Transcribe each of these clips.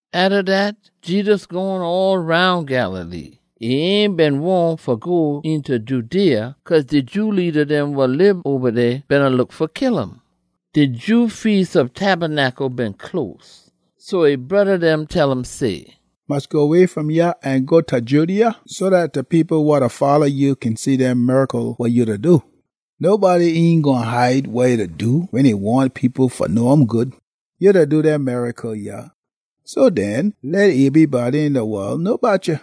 Atta dat, Jedus gone all roun Galilee. E ain been wahn fa go eenta Judea, cause de Jew leada dem wa lib oba dey beena look fa kill um. De Jew Feas ob Tabernacle been close. So e broda dem tell um say, “Mus go way fom yah an go ta Judea, so dat de people wa da folla ya kin see dem miracle wa ya da do. Nobody ain gwine hide wa e da do wen e wahn people fa know um good. Ya da do dem miracle yah, so den, leh ebrybody een de wol know bout ya!”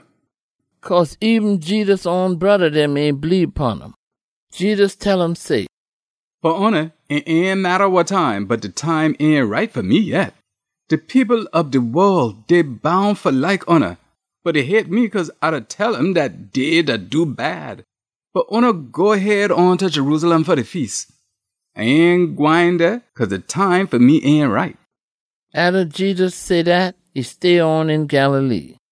(Cause eben Jedus own broda dem ain bleebe pon um.) Jedus tell um say, “Fa oona, e ain matta wa time, bot de time ain right fa me yet. De people ob de wol, dey boun fa like oona. Bot dey hate me cause A da tell um dat dey da do bad. Bot oona go head on ta Jerusalem fa de Feas. A ain gwine dey cause de time fa me ain right.” Atta Jedus say dat, e stay on een Galilee.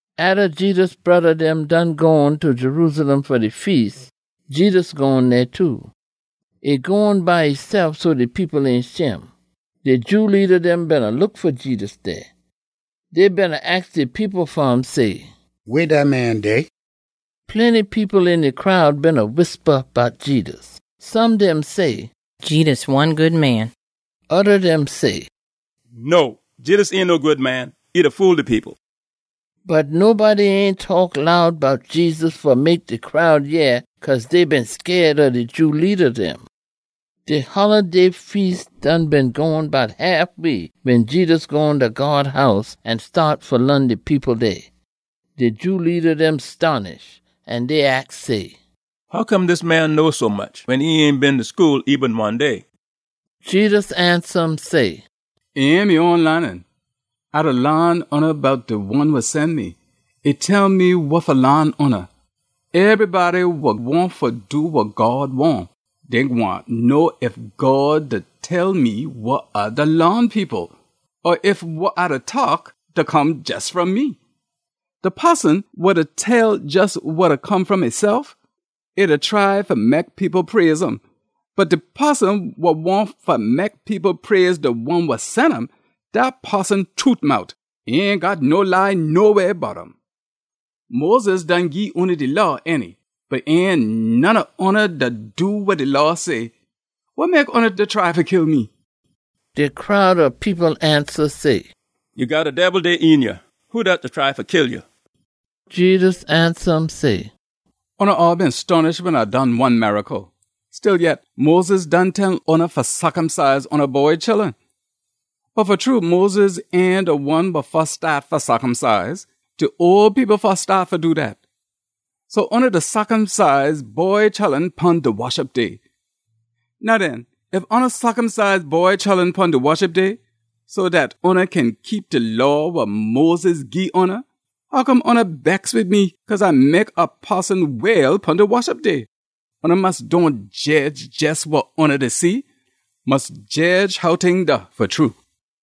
Atta Jedus broda dem done gone ta Jerusalem fa de Feas, Jedus gone dey too. E gone by esef so de people ain shim. De Jew leada dem beena look fa Jedus dey. Dey beena aks de people fa um say, “Weh dat man dey?” Plenty people een de crowd beena whispa bout Jedus. Some dem say, “Jedus one good man.” Oda dem say, “No, Jedus ain no good man. E da fool de people.” Bot nobody ain taak loud bout Jedus fa mek de crowd yeh cause dey been scaid ob de Jew leada dem. De holiday feas done been gone bout haf way wen Jedus gone ta God House an staat fa laan de people dey. De Jew leada dem stonish, an dey aks say, “Hoccome dis man know sommuch wen e ain been ta school eben one day?” Jedus ansa um say, “E ain me own laanin. A da laan oona bout de one wa sen me. E tell me wa fa laan oona. Ebrybody wa wahn fa do wa God wahn, dey gwine know ef God da tell me wa A da laan people or ef wa A da taak da come jes fom me. De poson wa da tell jes wa da come fom esef, e da try fa mek people praise um. Bot de poson wa wahn fa mek people praise de one wa sen um, dat poson trute mout. E ain got no lie noweh bout um. Moses done gii oona de Law, ainty? Bot ain none ob oona da do wa de Law say. Wa mek oona da try fa kill me?” De crowd ob people ansa say, “Ya got a debil dey een ya! Who dat da try fa kill ya?” Jedus ansa um say, “Oona all been stonish wen A done one miracle. Stillyet, Moses done tell oona fa circumcise oona boy chullun. (Bot fa true Moses ain de one wa fus staat fa circumcise. De ole people fus staat fa do dat). So oona da circumcise boy chullun pon de Woshup Day. Now den, ef oona circumcise boy chullun pon de Woshup Day so dat oona kin keep de Law wa Moses gii oona, hoccome oona bex wid me cause A mek a poson well pon de Woshup Day? Oona mus dohn jedge jes wa oona da see. Mus jedge how ting da fa true.”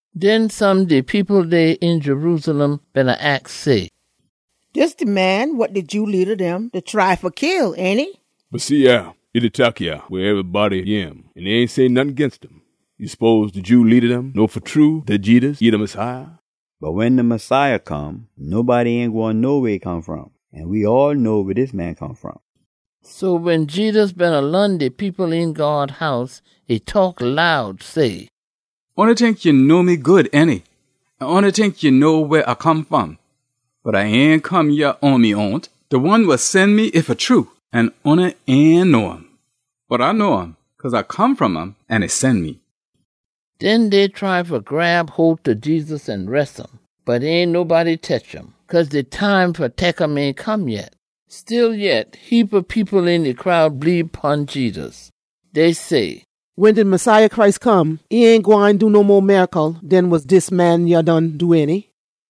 Den some de people dey een Jerusalem beena aks say, “Dis de man wa de Jew leada dem da try fa kill, ainty? Bot see yah, e da taak yah weh ebrybody yeh um, an dey ain say nottin ginst um! Ya spose de Jew leada dem know fa true dat Jedus, e de Messiah? Bot wen de Messiah come, nobody ain gwine know weh e come fom, an we all know weh dis man come fom.” So wen Jedus beena laan de people een God House, e taak loud say, “Oona tink ya know me good, ainty? An oona tink ya know weh A come fom. Bot A ain come yah on me own. De one wa sen me, e fa true, an oona ain know um. Bot A know um, cause A come fom um an e sen me.” Den dey try fa grab hole ta Jedus an res um, bot ain nobody tetch um, cause de time fa tek um ain come yet. Stillyet, heapa people een de crowd bleebe pon Jedus. Dey say, “Wen de Messiah Christ come, e ain gwine do no mo miracle den wa dis man yah done do, ainty?”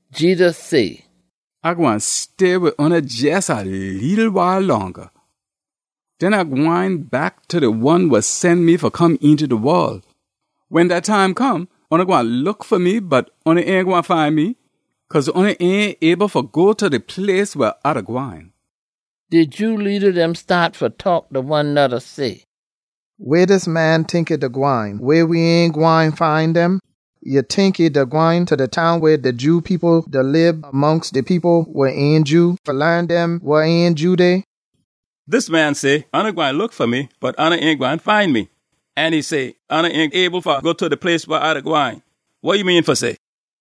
Jedus say, “A gwine stay wid oona jes a leetle wile longa. Den A gwine back ta de one wa sen me fa come eenta de wol. Wen dat time come, oona gwine look fa me bot oona ain gwine find me, cause oona ain able fa go ta de place weh A da gwine.” De Jew leada dem staat fa taak ta one noda say, “Weh dis man tink e da gwine weh we ain gwine find um? Ya tink e da gwine ta dem town weh de Jew people da lib mongst de people wa ain Jew, fa laan dem wa ain Jew dey? Dis man say, ‘Oona gwine look fa me, bot oona ain gwine find me.’ An e say, ‘Oona ain able fa go ta de place weh A da gwine.’ Wa e mean fa say?”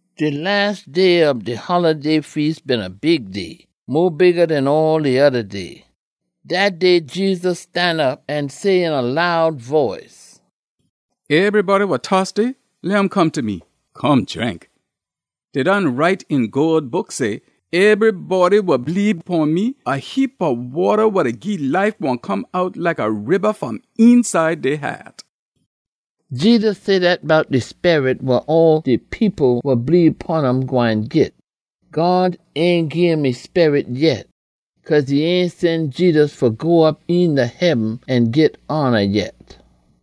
De las day ob de holiday feas been a big day, mo bigga den all de oda day. Dat day Jedus stanop an say een a loud boice, “Ebrybody wa tosty, leh um come ta me. Come drink. Dey done write een God Book say, ‘Ebrybody wa bleebe pon me, a heapa wata wa da gii life gwine come out like a riba fom eenside dey haat.’” Jedus say dat bout de Sperit wa all de people wa bleebe pon um gwine git. God ain gim e Sperit yet, cause e ain sen Jedus fa go op eenta heaben an git hona yet.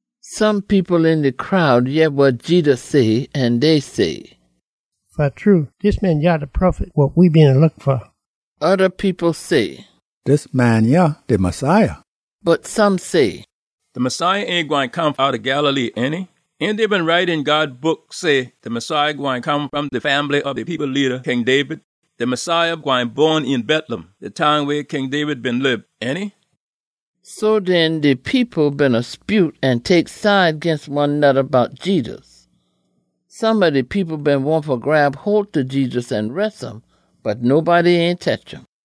Some people een de crowd yeh wa Jedus say an dey say, “Fa true, dis man yah de Prophet wa we beena look fa!” Oda people say, “Dis man yah de Messiah.” Bot some say, “De Messiah ain gwine come outta Galilee, ainty? Ain dey been write een God Book say de Messiah gwine come fom de fambly ob de people leada, King David? De Messiah gwine bon een Betlem, de town weh King David been lib, ainty?” So den, de people beena spute an tek side ginst one noda bout Jedus. Some ob de people been wahn fa grab hole ta Jedus an res um, bot nobody ain tetch um.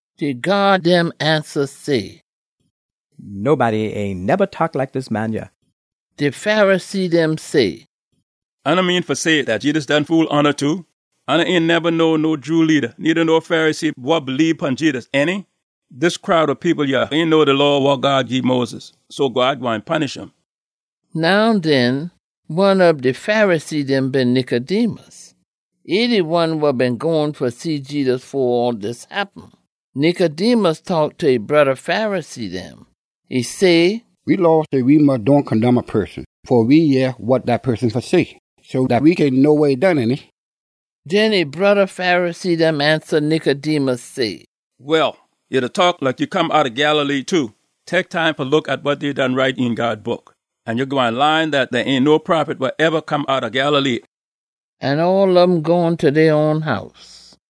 De gyaad dem ansa say, “Nobody ain neba taak like dis man yah.” De Pharisee dem say, “Oona mean fa say dat Jedus done fool oona, too? Oona ain neba know no Jew leada needa no Pharisee wa bleebe pon Jedus, ainty? Dis crowd ob people yah ain know de Law wa God gii Moses, so God gwine punish um!” Now den, one ob de Pharisee dem been Nicodemus. E de one wa been gone fa see Jedus fo all dis happen. Nicodemus taak ta e broda Pharisee dem. E say, “We Law say we mus dohn condemn a poson fo we yeh wa dat poson got fa say, so dat we kin know wa e done, ainty?” Den e broda Pharisee dem ansa Nicodemus say, “Well, ya da taak like ya come outta Galilee too. Tek time fa look at wa dey done write een God Book an ya gwine laan dat dey ain no prophet wa eba come outta Galilee.” [ An all ob um gone ta dey own house.]